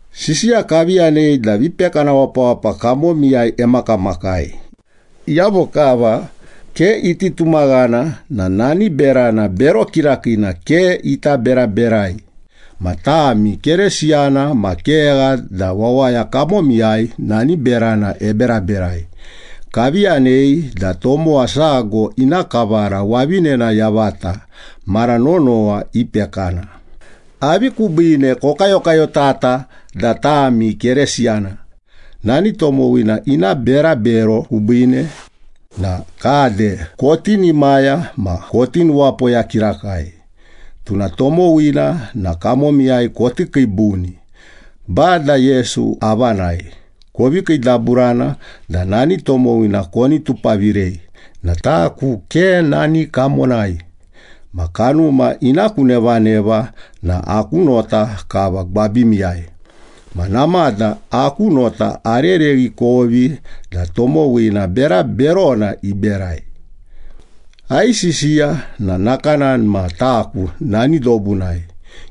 Sisiya kavi yanei da vipekana wapawapa kamomiyai emakamakai. Iyavo kava ke iti tumaghana na nani berana bero kirakiina ke ita beraberai. Ma tami Keresiyana ma kegha da wawaya kamomiyai nani berana eberaberai. Kavi yanei da tomowa sago ina kavara wavinena yavata mara nonowa ipekana. Avi kubiine kokayokayotata da tami Keresiyana? Nani tomowina ina berabero kubiine na kade kotinimaya ma koti nuwapoya kirakai. Tuna tomowina na kamomiyai koti kiibuni. Bada Yesu avanai kovi kiidaburana da nani tomowina koni tupavirei na taku ke nani kamonai, ma kanuma ina ku nevaneva na aku nota kava gwabimiyai. Ma namada aku nota arereghi ikovi da tomowina bera berona iberai. Aisisiya na nakanani ma taku nani dobunai.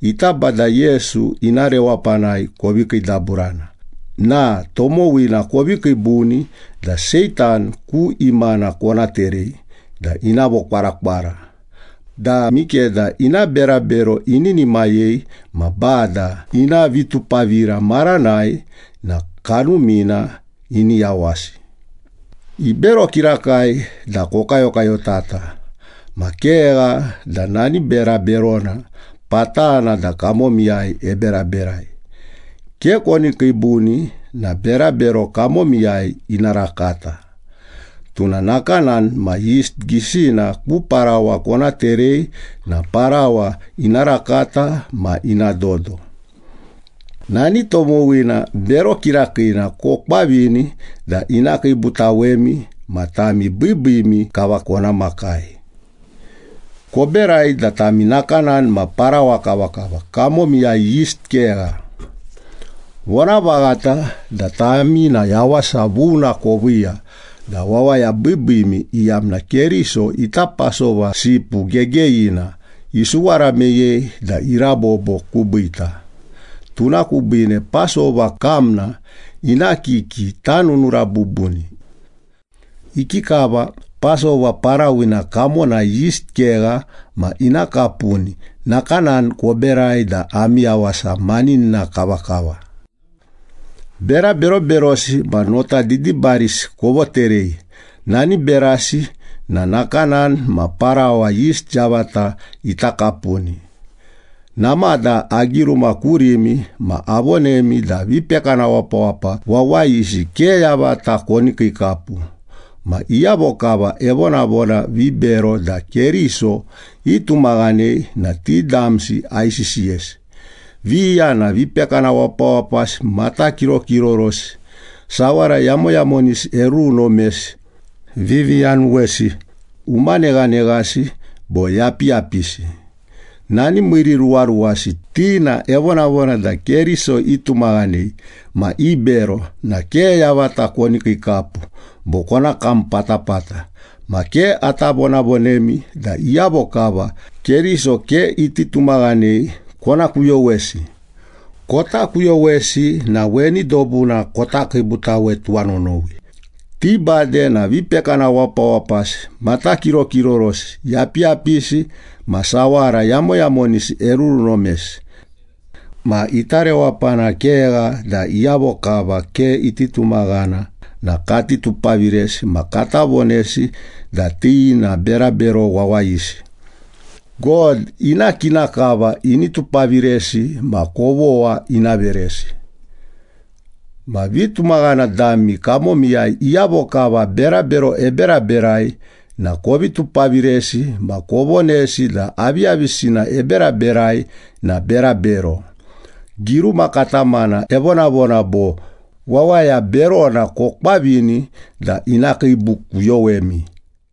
Ita Bada Yesu ina rewapanai kovi kiidaburana na tomowina kovi kiibuni da Seitan ku imana kona terei da ina vokwarakwara da mikeda ina berabero ininimayei ma Bada ina vitupavira maranai na kanumina ini yawasi. Ibero kirakai da kokayokayotata ma kegha da nani bera berona patana da kamomiyai eberaberai. Ke koni kiibuni na berabero kamomiyai ina rakata. Tuna nakanani ma yist gisina ku parawa kona terei na parawa ina rakata ma ina dodo.” Nani tomowina bero kirakiina kokwavini da ina kiibutawemi ma tami biibiimi kava kona makai. Koberai da tami nakanani ma parawa kavakava, kamomiyai yist kegha. Vonavaghata da tami na yawasa vuna koviiya da wawaya biibiimi, iyamna Keriso ita Pasova sipu gegeyina, isuwara meyei da irabobo kubiita. Tuna kubiine Pasova kamna ina kiki tanunura bubuni. Ikikava Pasova parawina kamonai yist kegha ma ina kapuni, nakanani koberai da ami yawasa maninina kavakava. Bera beroberosi ma nota didibarisi kovoterei, nani berasi na nakanani ma parawa yist yavata ita kapuni. Namada agiruma kurimi ma avonemi da vipekana wapawapa wawayisi ke yavata koni kiikapu. Ma iyavo kava evonavona vibero da Keriso itumaghanei na ti damsi aisisiyesi. Viya na vipekana wapawapasi, matakirokirorosi, sawara yamoyamonisi erurunomesi, viviyanuwesi, umaneghaneghasi bo yapiyapisi. Nani miiriruwaruwasi, ti na evonavona da Keriso itumaghanei ma ibero na ke yavata koni kiikapu bo kona kam patapata. Ma ke ata vonavonemi da iyavo kava Keriso ke iti tumaghanei kona kuyowesi. Kota kuyowesi na weni dobuna kota kiibutawe tuwanonowi. Ti bade na vipekana wapawapasi, matakirokirorosi, yapiyapisi ma sawara yamoyamonisi erurunomesi. Ma ita rewapana kegha da iyavo kava ke iti tumaghana na kati tupaviresi ma kata vonesi da ti na berabero wawayisi. God ina kina kava ini tupaviresi ma kovogha ina veresi. Ma vitumaghana dami kamomiyai iyavo kava berabero eberaberai na kovi tupaviresi ma kovonesi da aviyavisina eberaberai na berabero. Giruma katamana evonavona bo, “Wawaya berona kokwavini da ina kiibukuyowemi.”